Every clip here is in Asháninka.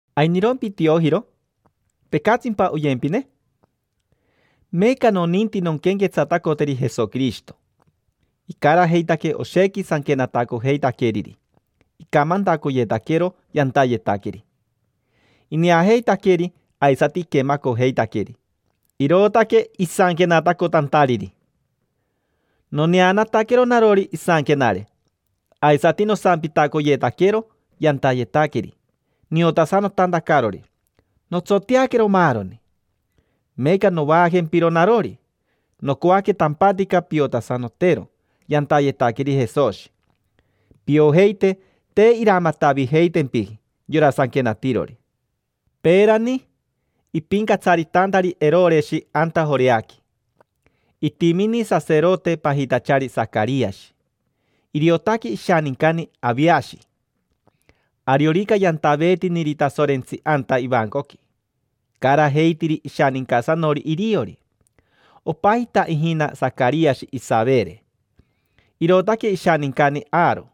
¿Ainirompi Tiojiro? ¿Tecatsimpa oyempine? Meeca noninti nonquenquetsatacoteri Jesoquirishito. Icarajeitaque oshequi sanquenatacojeitaqueriri, icamantacoyetaquero yantayetaqueri. Ineajeitaqueri, aisati iquemacojeitaqueri, irootaque isanquenatacotantariri. Noneanataquero narori isanquenare, aisati nosampitacoyetaquero yantayetaqueri niotasanotantacarori, notsoteaquero maaroni. Meeca novaajempiro narori, nocoaque tampatica piotasanotero yantayetaqueri Jesoshi, piojeite te iramatavijeitempiji yora sanquenatirori. Peerani, ipincatsaritantari Eroreshi anta Joreaqui, itimini saserote pajitachari Sacariashi. Iriotaque ishanincani Aviashi: ariorica yantaveetiniri Tasorentsi anta ivancoqui, icarajeitiri ishanincasanori iriori. Opajita ijina Sacariashi Isavere, irootaque ishanincani Aaro.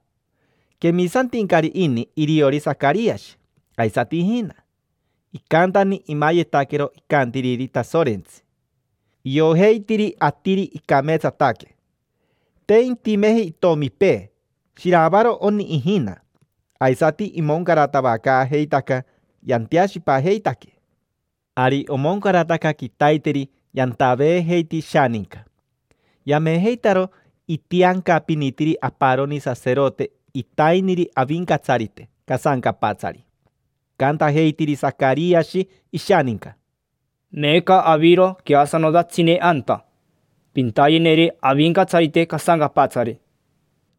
Quemisantincari ini iriori Sacariashi, aisati ijina. Icantani imayetaquero icantiriri Tasorentsi, iojeitiri atiri icameetsataque. Te intimeji itomipee: shiravaro oni ijina, aisati imoncaratavacaajeitaca yanteashipajeitaque. Ari omoncarataca quitaiteri yantaveejeiti ishaninca. Yamejeitaro itiancapinitiri aparoni saserote itainiri Avincatsarite casancapatsari. Icantajeitiri Sacariashi ishaninca: —Meeca aviro queasanotatsine anta, pintayeneri Avincatsarite casancapatsari.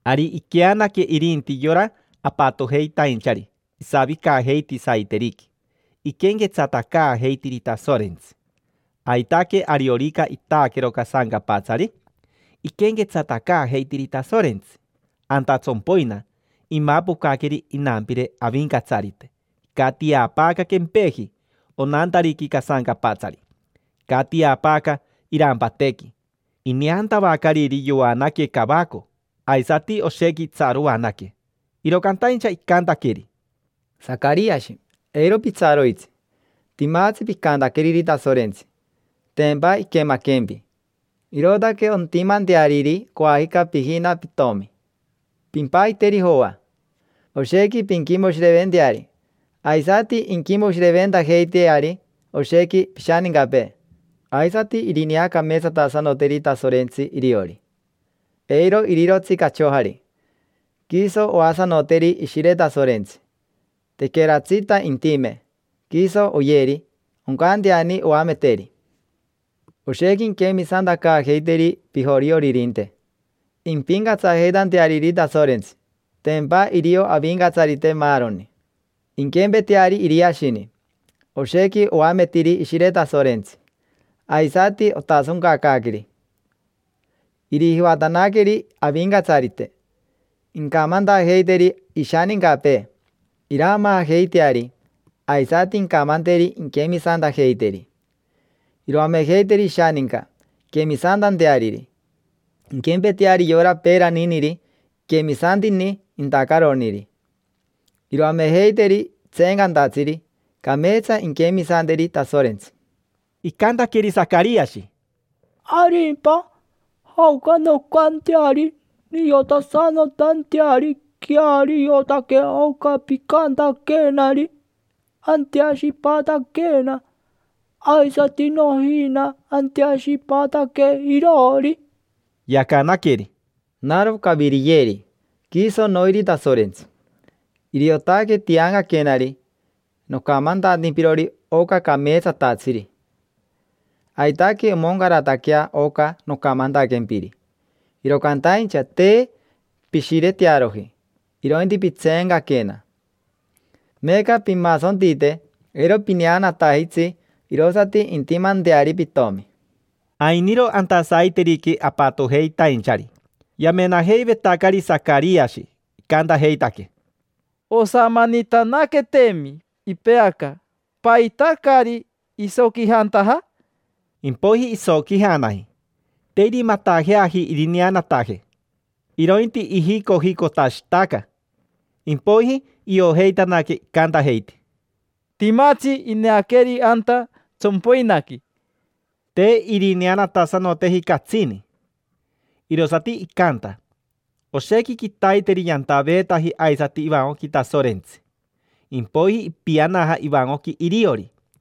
Ari iqueanaque, irinti yora apatojeitainchari isavicajeiti saiteriqui, iquenquetsatacaajeitiri Tasorentsi. Aitaque ariorica itaaquero casancapatsari, iquenquetsatacaajeitiri Tasorentsi. Anta tsompoina, imapocaqueri inampire Avincatsarite, icatiapaaca quempeji onantariqui casancapatsari, icatiapaaca irampatequi. Ineantavacariri yoanaque cavaco, aisati oshequi itsaroanaque. Iro cantaincha icantaqueri: —Sacariashi, eiro pitsaroitsi. Timatsi picantaqueriri Tasorentsi; tempa iquemaquempi, irootaque ontimanteariri coajica pijina pitomi. Pimpajiteri Joa. Oshequi pinquimoshireventeari, aisati inquimoshireventajeiteari oshequi pishanincapee. Aisati irineacameetsatasanoteri Tasorentsi iriori. Eiro irirotsi cachojari. Quiso oasanoteri Ishire Tasorentsi, tequeratsita intime, quiso oyeri: oncanteani oameteri. Oshequi inquemisantacaajeiteri pijorioririnte, impincatsajeitanteariri Tasorentsi, tempa irio Avincatsarite maaroni. Inquempeteari Iriashini, oshequi oametiri Ishire Tasorentsi, aisati otasoncacaaqueri. Irijivatanaqueri Avincatsarite, incamantajeiteri ishanincapee iraamaajeiteari, aisati incamanteri inquemisantajeiteri. Iroamejeiteri ishaninca inquemisantanteari, inquempeteari yora peeraniniri iquemisantini intacaroniri. Iroamejeiteri tseencantatsiri cameetsa inquemisanteri Tasorentsi. Icantaqueri Sacariashi: —¿Arimpa? ¿Jaoca noncanteari niotasanotanteari queariotaque oca picantaquenari? Anteashipataquena, aisati nojina, anteashipataque iroori. Yacanaqueri: —Naro Caviriyeri, quiso noiri Tasorentsi. Iriotaque tiancaquenari nocamantantimpirori oca cameetsatatsiri. Aitaque omoncarataquea oca nocamantaquempiri, iro cantaincha te pishiretearoji, irointi pitseencaquena. Meeca pimasontite, eiro pineanatajitsi irosati intimanteari pitomi. Ainiro anta saiteriqui apatojeitainchari yamenaajeivetacari Sacariashi, icantajeitaque: —Osamanitanaqueteemi ipeaca. ¿Paita caari isoquijantaja? Impoiji isoquijanaji, te irimatajeaji irineanataje, irointi ijicojicotashitaca. Impoiji iojeitanaque, icantajeiti: —Timatsi ineaqueri anta tsompoinaqui. Te irineanatasanoteji catsini. Irosati icanta, oshequi quitaiteri yantaveetaji aisati ivancoqui Tasorentsi. Impoiji ipianaja ivancoqui iriori.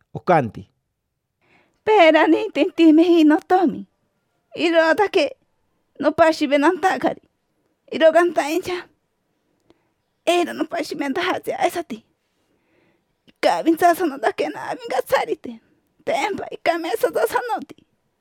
Ocanti: —Peerani te intimeji notomi, irootaque nopashiventantacari, iro cantaincha eiro nopashiventajatsi aisati. Icavintsaaquena Avincatsarite, tempa icameetsatasanoti.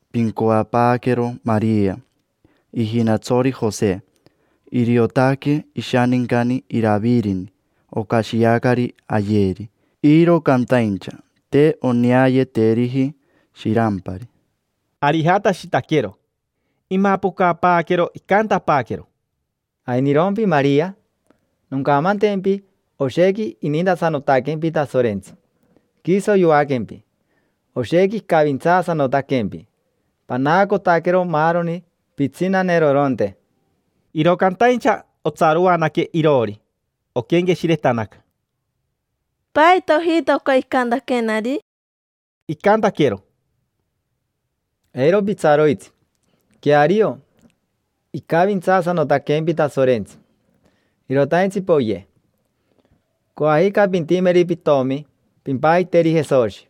Pincoapaaquero Maria, ijinatsori Jose. Iriotaque ishanincani Iravirini. Ocashiacari ayeri, iro cantaincha te oneayeteriji shirampari. Ari ijatashitaquero. Imapocapaaquero, icantapaaquero: —¿Ainirompi, Maria? Noncamantempi: oshequi inintasanotaquempi Tasorentsi, quiso yoaquempi. Oshequi icavintsaasanotaquempi, panaacotaquero maaroni pitsinaneroronte. Iro cantaincha otsaroanaque iroori, oquenqueshiretanaca: “¿Paita ojita oca icantaquenari?” Icantaquero: —Eiro pitsaroitsi. Queario, icavintsaasanotaquempi Tasorentsi. Irotaintsi poye. Coajica pintimeri pitomi, pimpajiteri Jesoshi.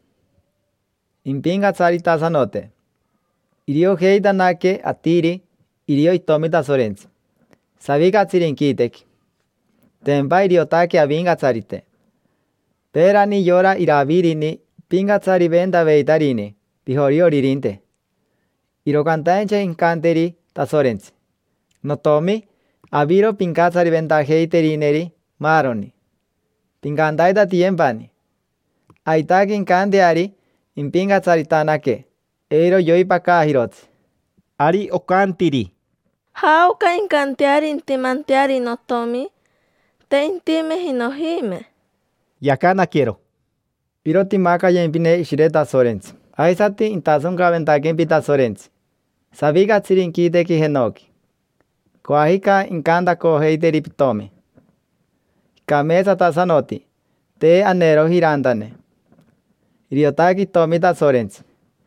Impincatsaritasanote. Iriojeitanaque atiri irio Itomi Tasorentsi, savicatsiri inquitequi. Tempa iriotaque Avincatsarite. Peerani yora Iravirini ipincatsariventaveitarini pijorioririnte. Iro cantaincha incanteri Tasorentsi: “Notiomi, aviro pincatsariventajeiterineri maaroni, pincantaitatiyempani”. Aitaque incanteari impincatsaritanaque, eiro yoipacaajirotsi. Ari ocantiri: —¿Jaoca incanteari intimanteari notomi? Te intimeji nojime. Yacanaquero: —Iro timacayempine Ishire Tasorentsi. Aisati intasoncaventaquempi Tasorentsi, savicatsiri inquitequi jenoqui. Coajica incantacojeiteri pitomi: “Icameetsatasanoti, te aneeroji irantane. Iriotaque Itomi Tasorentsi”.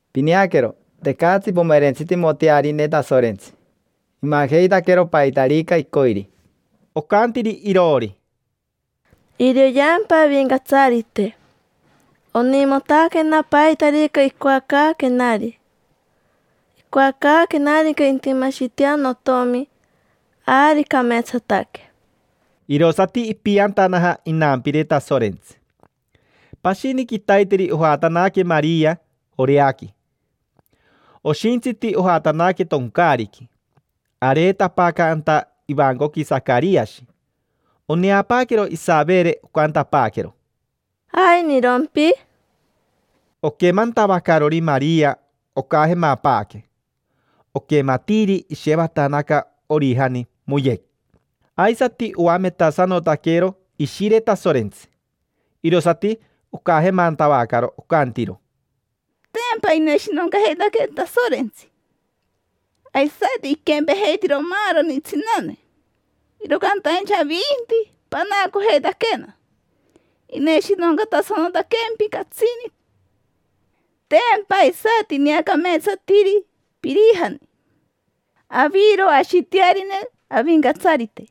Pineaquero, tecatsi pomerentsitimotearine Tasorentsi, imajeitaquero paitarica icoiri. Ocantiri iroori: —Irioyeampa Avincatsarite. Onimotaquena paitarica icoacaaquenari: icoacaaquenarica intimashitea notomi, ari cameetsataque. Irosati ipiantanaja inampire Tasorentsi. Pashini quitaiteri ojatanaque Maria Joreaqui. Oshintsiti ojatanaque toncaariqui. Areetapaaca anta ivancoqui Sacariashi. Oneapaaquero Isavere, ocantapaaquero: —¿Ainirompi? Oquemantavacarori Maria ocajemapaaque, oquematiiri ishevatanaca orijani, moyec. Aisati oametasanotaquero Ishire Tasorentsi, irosati ocajemantavacaro. Ocantiro: —Tempa ineshinoncajeitaquee Tasorentsi, aisati iquempejeitiro maaroni tsinane; iro cantaincha avinti, panaacojeitaquena: ineshinoncatasanotaquempi catsini. Tempa aisati ineacameetsatiri pirijani. Aviro ashitearine Avincatsarite.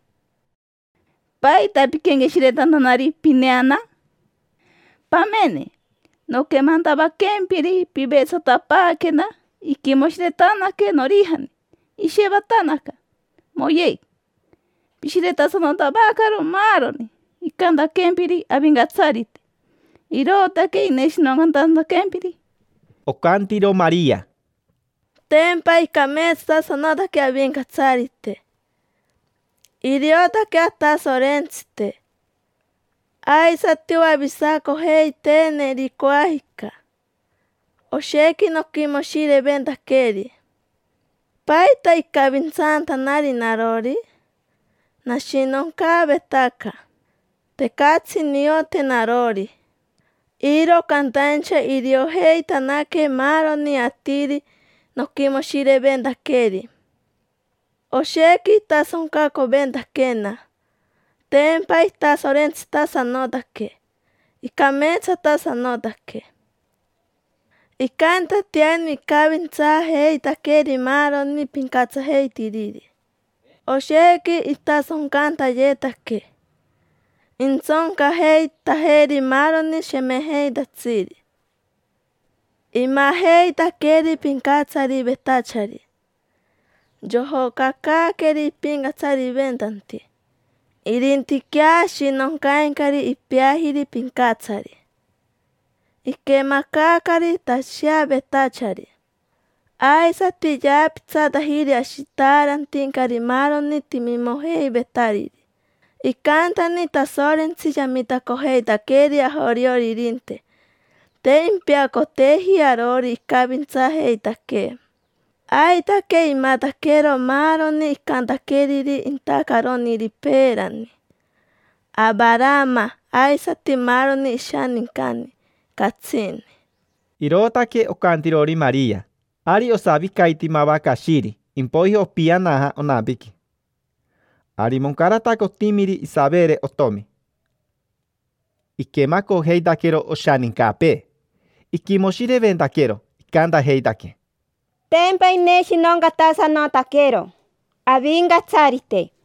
¿Paita piquenqueshiretantanari pineana? Pamene, noquemantavaquempiri pivetsatapaaquena, iquimoshiretanaque norijani, ishevatanaca, moyec. Pishiretasanotavacaro maaroni icamantaquempiri Avincatsarite, irootaque ineshinoncatantaquempiri. Ocantiro Maria: —Tempa icameetsatasanotaque Avincatsarite, iriotaque Atasorentsite aisati oavisacojeiteeneri coajica. Oshequi noquimoshireventaqueri. ¿Paita icavintsantanari narori? Nashinoncaavetaca, tecatsi niote narori. Iro cantaincha iriojeitanaque maaroni atiri noquimoshireventaqueri. Oshequi itasoncacoventaquena, tempa itasorentsitasanotaque, icameetsatasanotaque. Icantatiani icavintsaajeitaqueri maaroni pincatsajeitiriri. Oshequi itasoncantayetaque. Intsoncajeitajeri maaroni shemejeitatsiri. Imajeitaqueri pincatsarivetachari yojocacaaqueri ipincatsariventanti. Irintiquea ashinoncaincari ipeajiri pincatsari. Iquemacaacari tasheavetachari, aisati yaapitsatajiri ashitaarantincari maaroni timimojeivetariri. Icantani Tasorentsi yamitacojeitaqueri ajorioririnte, te impeacoteeji arori icavintsaajeitaquee. Aitaque imataquero maaroni icantaqueriri intacaroniri peerani: Avarama aisati maaroni ishanincani, catsini. Irootaque ocantirori Maria. Ari osavicaiti mava cashiri, impoiji opianaja onampiqui. Ari moncarataca otimiri Isavere otomi. Iquemacojeitaquero oshanincapee, iquimoshireventaquero. Icantajeitaque: —Tempa ineshinoncatasanotaquero Avincatsarite.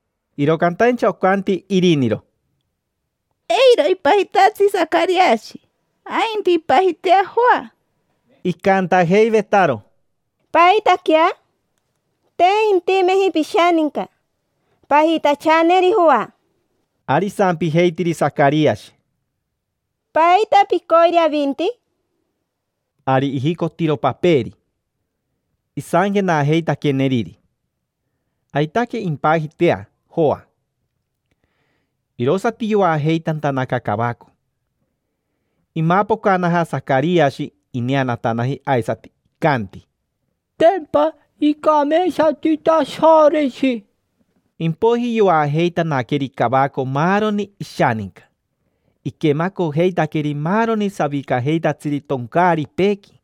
Iro cantaincha ocanti iriniro: —Eiro ipajitatsi Sacariashi, ainti impajitea Joa. Icantajeivetaro: —¿Paitaquea? Te intimeji pishaninca pajitachaneri Joa. Ari isampijeitiri Sacariashi: —¿Paita picoiri avinti? Ari ijicotiro paperi, isanquenajeitaqueneriri: “Aitaque, impajitea Joa”. Irosati yoajeitantanaca cavaco. Imapocanaja Sacariashi ineanataji aisati, icanti: —Tempa icameetsati Tasorentsi. Impoiji yoajeitanaqueri cavaco maaroni ishaninca. Iquemacojeitaqueri maaroni savicajeitatsiri toncaaripeequi: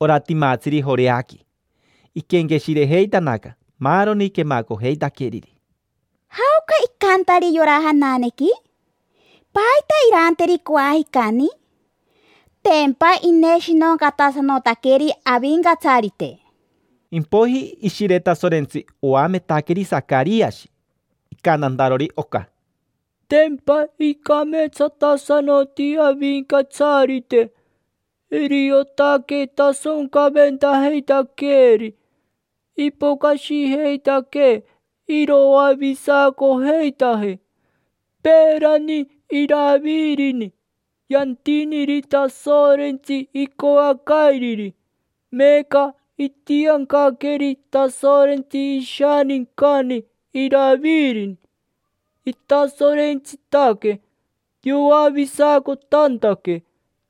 ora timatsiri Joreaqui. Iquenqueshirejeitanaca maaroni quemacojeitaqueriri: “¿Jaoca icantari yora jananequi? ¿Paita iranteri coajicani? Tempa ineshinoncatasanotaqueri Avincatsarite”. Impoiji Ishire Tasorentsi oametaqueri Sacariashi, icantantarori oca: —Tempa icameetsatasanoti Avincatsarite, iriotaque tasoncaventajeitaqueeri. Ipocashijeitaquee iroavisacojeitajee. Peerani Iravirini yantiniri Tasorentsi icoacairiri. Meeca itiancaqueri Tasorentsi ishanincani Iravirini, itasorentsitaque, yoavisacotantaque.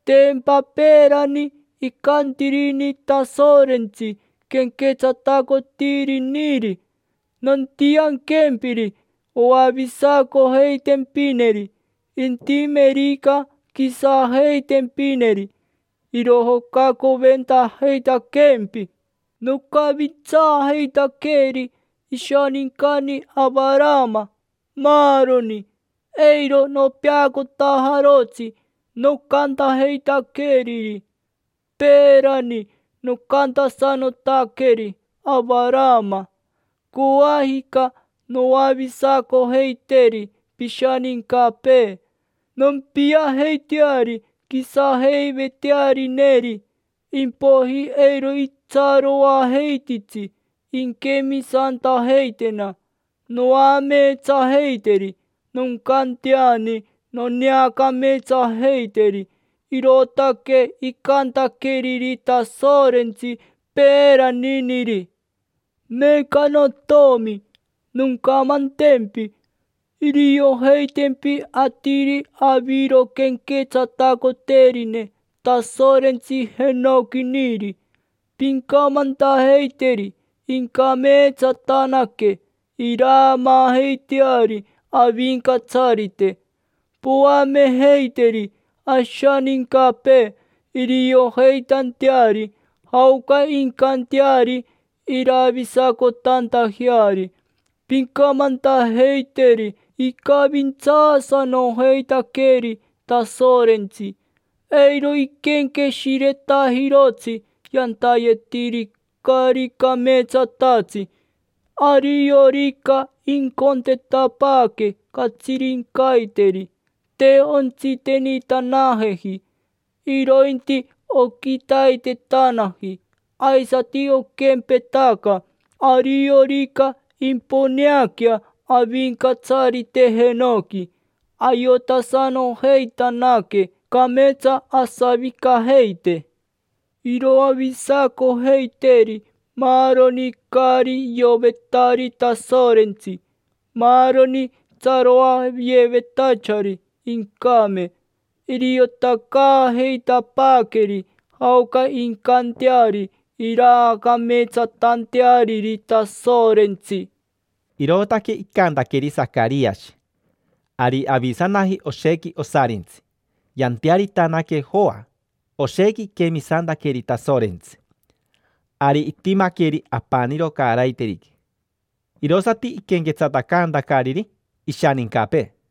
Tempa peerani icantirini Tasorentsi quenquetsatacotiriniri: “Nontianquempiri oavisacojeitempineri, intimerica quisajeitempineri, irojocacoventajeitaquempi. Noncavintsaajeitaqueri ishanincani Avarama, maaroni. Eiro nopeacotajarotsi nocantajeitaqueriri. Peerani nocantasanotaqueri Avarama: ‘Coajica noavisacojeiteri pishanincapee, nompiajeiteari quisajeivetearineri, impoiji eiro itsaroajeititsi inquemisantajeitena. Noameetsajeiteri, noncanteani noneacameetsajeiteri’”. Irootaque icantaqueriri Tasorentsi peeraniniri. Meeca notiomi, noncamantempi: iriojeitempi atiri aviro quenquetsatacoterine Tasorentsi jenoquiniri. Pincamantajeiteri incameetsatanaque, iraamaajeiteari Avincatsarite. Poamejeiteri ashanincapee iriojeitanteari jaoca incanteari iravisacotantajeari. Pincamantajeiteri icavintsaasanojeitaqueri Tasorentsi, eiro iquenqueshiretajirotsi yantayetiri caari cameetsatatsi. Ariorica icontetapaaque catsirincaiteri, te ontsitenitanajeji, irointi oquitaitetanaji. Aisati oquempetaca, ariorica imponeaquea Avincatsarite jenoqui, ayotasanojeitanaque cameetsa asavicajeite. Iroavisacojeiteri maaroni caari iovetari Tasorentsi, maaroni tsaroayevetachari incame. Iriotacaajeitapaaqueri jaoca incanteari iraacameetsatanteariri Tasorentsi. Irootaque icantaqueri Sacariashi. Ari avisanaji oshequi osarintsi, yantearitanaque Joa, oshequi iquemisantaqueri Tasorentsi. Ari itimaqueri apaniro caaraiteriqui, irosati iquenquetsatacantacariri ishanincapee.